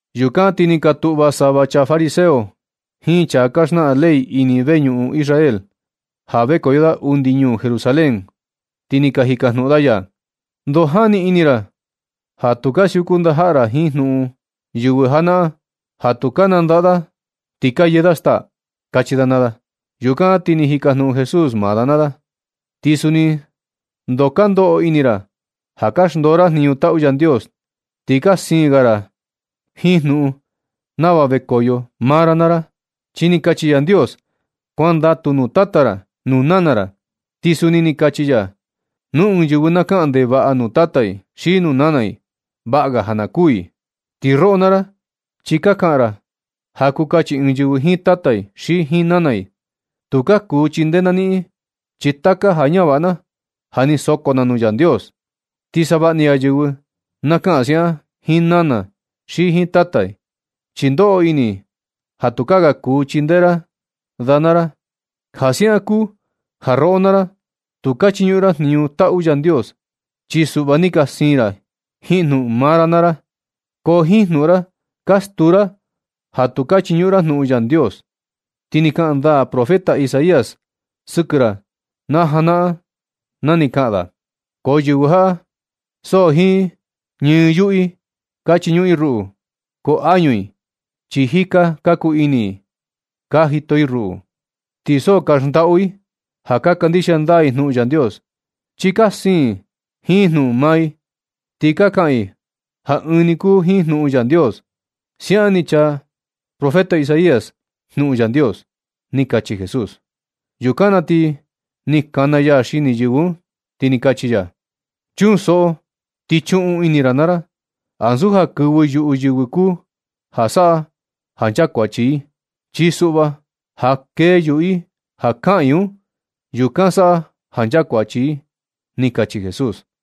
Yukan ti ni ka tuꞌva sava chaa fariseo jiin chaa ka xnaꞌan ley ini veñuꞌun Israel, ja vekoyo da undi ñuu Jerusalén, ti ni ka jikajnuꞌun da ya: ―¿Ndoo jani ini ra ja tu ka siuku ndajaꞌa ra jiin jnuꞌun yɨvɨ janaꞌan, ja tu ka nandaꞌa da ti ka yee da staa? ―kachi da naa da. Yukan ti ni jikajnuꞌun Jesús maa da naa da: ―¿Ti suni ndoo ka ndoꞌo ini ra ja ka xndoo ra jniñu taꞌu Yandios, ti ka siin ga ra jiin jnuꞌun nava vekoyo maa ra naa ra? Chi ni kachi Yandios: “Kuandatu nuu tata ra nuu nana ra.” Ti suni ni kachi ya: “Nu ɨɨn yɨvɨ na kaꞌan ndevaꞌa nuu tata i xi nuu nana i, vaꞌa ga ja na kuū i.” Ti roꞌo naa ra, chi ka kaꞌan ra ja kuu kachi ɨɨn yɨvɨ jiin tata i xi jiin nana i: “Tukaa kuu chindee na niꞌin, chi taka ja ñavaꞌa na ja ni soko na nuu Yandios.” Ti savaꞌa ni ga yɨvɨ na kaꞌan siaꞌan jiin nana i xi jiin tata i, chi ndoꞌo ini i ja tukaa ga kuu chindee ra da naa da. Ja siaꞌan kuu ja roꞌo naa ra, tu ka chiñuꞌun ra jniñu taꞌu Yandios, chi suꞌva ni ka siin ra jiin jnuꞌun maa ra naa ra. Ko jiin jnuꞌun ra, ka stuu ra ja tu ka chiñuꞌun ra jnuꞌun Yandios. Ti ni kaꞌan ndaa profeta Isaías sɨkɨ ra na janaꞌan na ni kaꞌan da: Ko yɨvɨ jaꞌa, so jiin yuꞌu i ka chiñuꞌun i ruꞌu, ko añu i chi jika ka kuu ini i ka jito i ruꞌu. Ti so ka xndaꞌu i ja ka kandixia ndaa i jnuꞌun Yandios, chi ka siin i jiin jnuꞌun maa i, ti ka kaꞌan i ja ɨɨn ni kuu jiin jnuꞌun Yandios. Siaꞌan ni chaa Isaías jnuꞌun Yandios ―ni kachi Jesús. Yukan na ti ni kana ya xini yɨvɨ un, ti ni kachi ya: ―Chunsoꞌo ti chuun ini naa ra. Ansu ja kɨvɨ yuꞌu yɨvɨ kuu ja saꞌa ja nchakuachi i, chi suꞌva ja kee yuꞌu i ja kaꞌan i un, yukan saꞌa ja nchakuachi i ―ni kachi Jesús.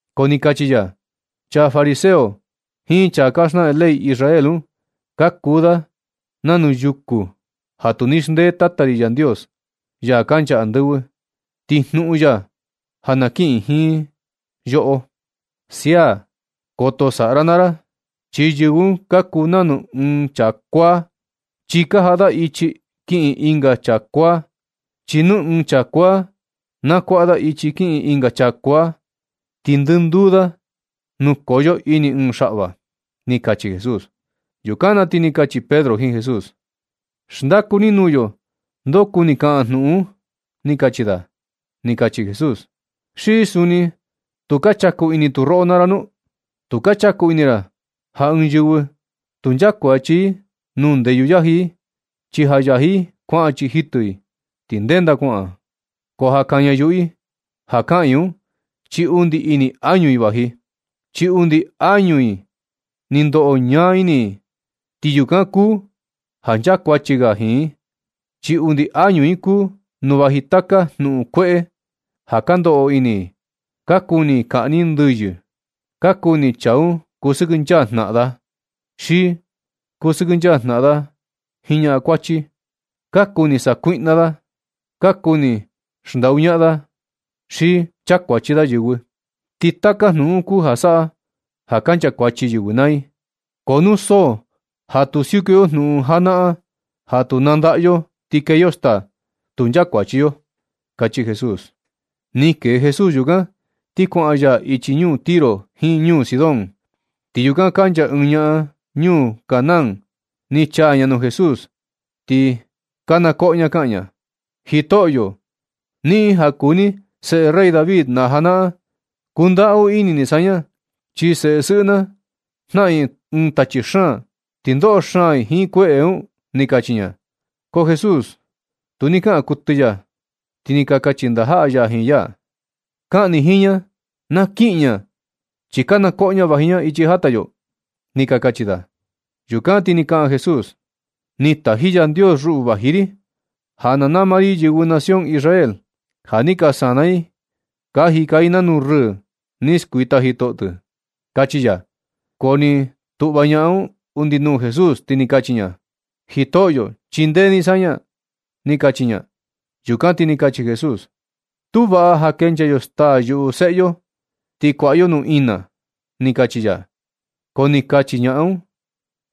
Ko ni kachi ya: ―Chaa fariseo jiin chaa ka xnaꞌan ley Israel un ka kuu da nanu yukū ja tu ni xndee Tata ri Yandios, ya kancha andɨvɨ, ti jnuꞌun ya ja na kiꞌin nɨ jiin yoꞌo. Sia, koto saꞌa r naa ra, chi yɨvɨ un ka kuu nanu ɨɨn chaa kuaa, chi ka jaꞌa da ichi kiꞌin ɨnga chaa kuaa. Chi nu ɨɨn chaa kuaa na kuaꞌa da ichi kiꞌin ɨnga chaa kuaa, ti ndɨnduu da nukoyo ini ɨɨn xaꞌva ―ni kachi Jesús. Yukan na ti ni kachi Pedro jiin Jesús: ―Xndaku ni nuu yo ndoo kuni kaꞌan jnuꞌun un ―ni kachi da. Ti ni kachi Jesús: ―¿Xi suni tu ka chaku ini tu roꞌo naa ra nu? Tu ka chaku ini ra ja ɨɨn yɨvɨ tu nchakuachi i nuu ndeyu yaji i, chi ja yaji i kuaꞌan chii jitɨ i, ti ndenda kuaꞌan. Ko ja kaña yuꞌu i, ja kaꞌan i un, chi undi ini añu i vaji, chi undi añu i ni ndoꞌo ñaa ini i, ti yukan kuu ja nchakuachi ga i jiin. Chi undi añu i kuu nu vaji taka jnuꞌun kueꞌe ka ndoꞌo ini i. Ka kuni i kaꞌni ɨɨn ndɨyɨ. Ka kuni chaa un kusɨkɨnchaa jnaꞌan da i, xi kusɨkɨnchaa da ñakuachi. Ka kuni sakuiꞌna da, ka kuni xndaꞌu ñaꞌan da xi chakuachi da yɨvɨ. Ti taka jnuꞌun un kuu ja saꞌa ja nchakuachi yɨvɨ naa i. Ko nu so ja tu siuku yo jnuꞌun janaꞌan ja tu nandaꞌa yo, ti kee yo staa, tu nchakuachi yo ―kachi Jesús. Ni kee Jesús yukan, ti kuaꞌan ya ichi ñuu Tiro jiin ñuu Sidón. Ti yukan kancha ɨɨn ñaꞌan ñuu Canaán, ni chaa ña nuu Jesús, ti kana koꞌo ña kaꞌan ña: ―¡Jitoꞌyo, niꞌin ja kuu ni seꞌe rey David na janaꞌan, kundaꞌu ini ni saña! Chi seꞌe sɨꞌɨ na jnaꞌan i ɨɨn tachi xaan, ti ndoꞌo xaan i jiin kueꞌe un ―ni kachi ña. Ko Jesús, tu ni kaꞌan kuɨtɨ ya. Ti ni ka kachi ndajaꞌa ya jiin ya: ―Kaꞌan ni jiin ña na kiꞌin ña, chi kana koꞌo ña vaji ña ichi jata yo ―ni ka kachi da. Yukan ti sa ni kaꞌan Jesús: ―Ni taji Yandios ruꞌu vaji ri, ja na nama ri yɨvɨ nación Israel, ja ni ka sana i ka jika i nanu rɨɨ ni skuita jitoꞌo tɨ ―kachi ya. Ko ni tuꞌva ñaꞌan un undi nuu Jesús, ti ni kachi ña: ―Jitoꞌyo, chindee ni saña ―ni kachi ña. Yukan ti ni kachi Jesús: ―Tu vaꞌa ja kenchaa yo staa yuꞌu seꞌe yo, ti kuaꞌa yo nuu ina ―ni kachi ya. Ko ni kachi ñaꞌan un: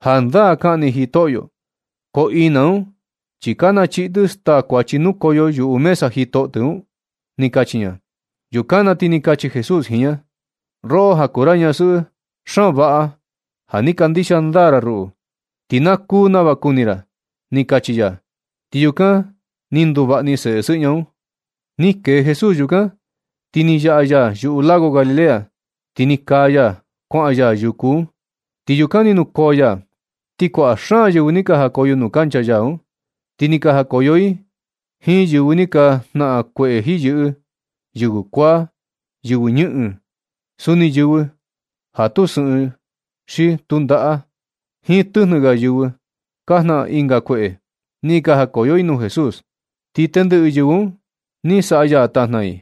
―Jandaa kaꞌan ni Jitoꞌyo, ko ina un chi ka nachii tɨ staa kuachi nukoyo yuꞌu mesa jitoꞌo tɨ ―ni kachi ña. Yukan na ti ni kachi Jesús jiin ña: ―Roꞌo ja kuu ra ñasɨꞌɨ, xaan vaꞌa ja ni kandixia ndaa ra ruꞌu, ti na kuu nava kuni ra ―ni kachi ya. Ti yukan, ni nduvaꞌa ni seꞌe sɨꞌɨ ña un. Ni kee Jesús yukan, ti ni yaꞌa ya yuꞌu lago Galilea, ti ni kaa ya, kuaꞌan ya yuku un, ti yukan ni nukoo ya. Ti kuaꞌa xaan yɨvɨ ni ni jakoyo nuu kancha ya un, ni ka jakoyo i jiin yɨvɨ ni ka jnaꞌan kueꞌe jiyɨꞌɨ, yɨvɨ kuaa, yɨvɨ ñɨꞌɨn, suni yɨvɨ ja tu sɨꞌɨn xi tu ndaꞌa, jiin tɨjnɨ ga yɨvɨ ka jnaꞌan ɨnga kueꞌe, ni ka jakoyo i nuu Jesús. Ti tendɨꞌɨ yɨvɨ un ni saꞌa ya tajna i.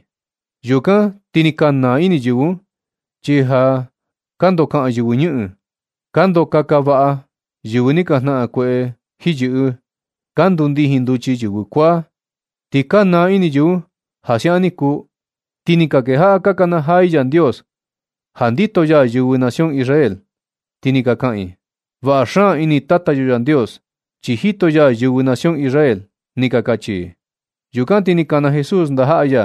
Yukan ti ni ka naa ini yɨvɨ un, chi ja kandokaꞌan yɨvɨ ñɨꞌɨn, ka ndoo kaka vaꞌa yɨvɨ ni ka jnaꞌan kueꞌe jiyɨꞌɨ, ka ndundijin nduchi yɨvɨ kuaa. Ti ka naa ini yɨvɨ un ja siaꞌan ni kuu, ti ni ka kejaꞌa ka nakanajaa i Yandios ja ndito ya yɨvɨ nación Israel, ti ni ka kaꞌan i: ―¡Vaꞌa xaan ini Tata yo Yandios, chi jito ya yɨvɨ nación Israel! ―ni ka kachi i. Yukan ti ni kana Jesús ndajaꞌa ya,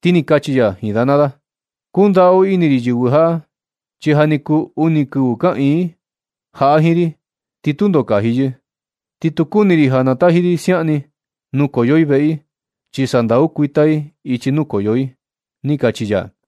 ti ni kachi ya jiin da naa da: ―Kundaꞌu ini ri yɨvɨ jaꞌa, chi ja ni kuu uni kɨvɨ kaꞌiin i jaꞌa jiin ri. Ti tundo kaji yɨ, ti tu kuni ri ja nataji ri siaꞌan ni, nukoyo i veꞌe i, chi sa sandau kuita i ichi nukoyo i ―ni kachi ya.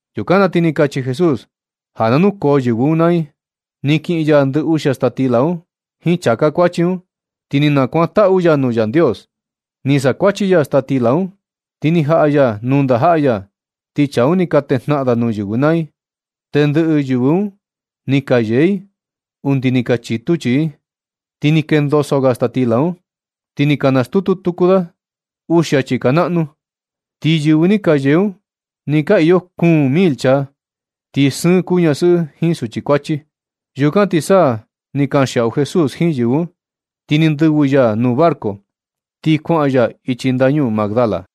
Yukan na ti ni kachi Jesús ja na nukoo yɨvɨ un naa i. Ni kiꞌin ya ndɨ uxia staa stila un jiin chāká kuachi un, ti ni nakuantaꞌu ya nuu Yandios. Ni sakuachi ya staa stila un, ti ni jaꞌa ya nuu ndajaꞌa ya, ti chaa un ni ka tejnaꞌan da nuu yɨvɨ naa i. Tendɨꞌɨ yɨvɨ un ni ka yee i undi ni ka chitu chii i. Ti ni kendoso ga staa stila un, ti ni ka nastutu tuku da uxia chika naꞌnu. Ti yɨvɨ ni ka yee un ni ka iyo kuun mil chaa, ti sɨɨn kuu ñasɨꞌɨ jiin suchi kuachi. Yukan ti sa ni kanxiaꞌu Jesús jiin yɨvɨ un, ti ni ndɨvɨ ya nuu barco, ti kuaꞌan ya ichi ndañuu Magdala.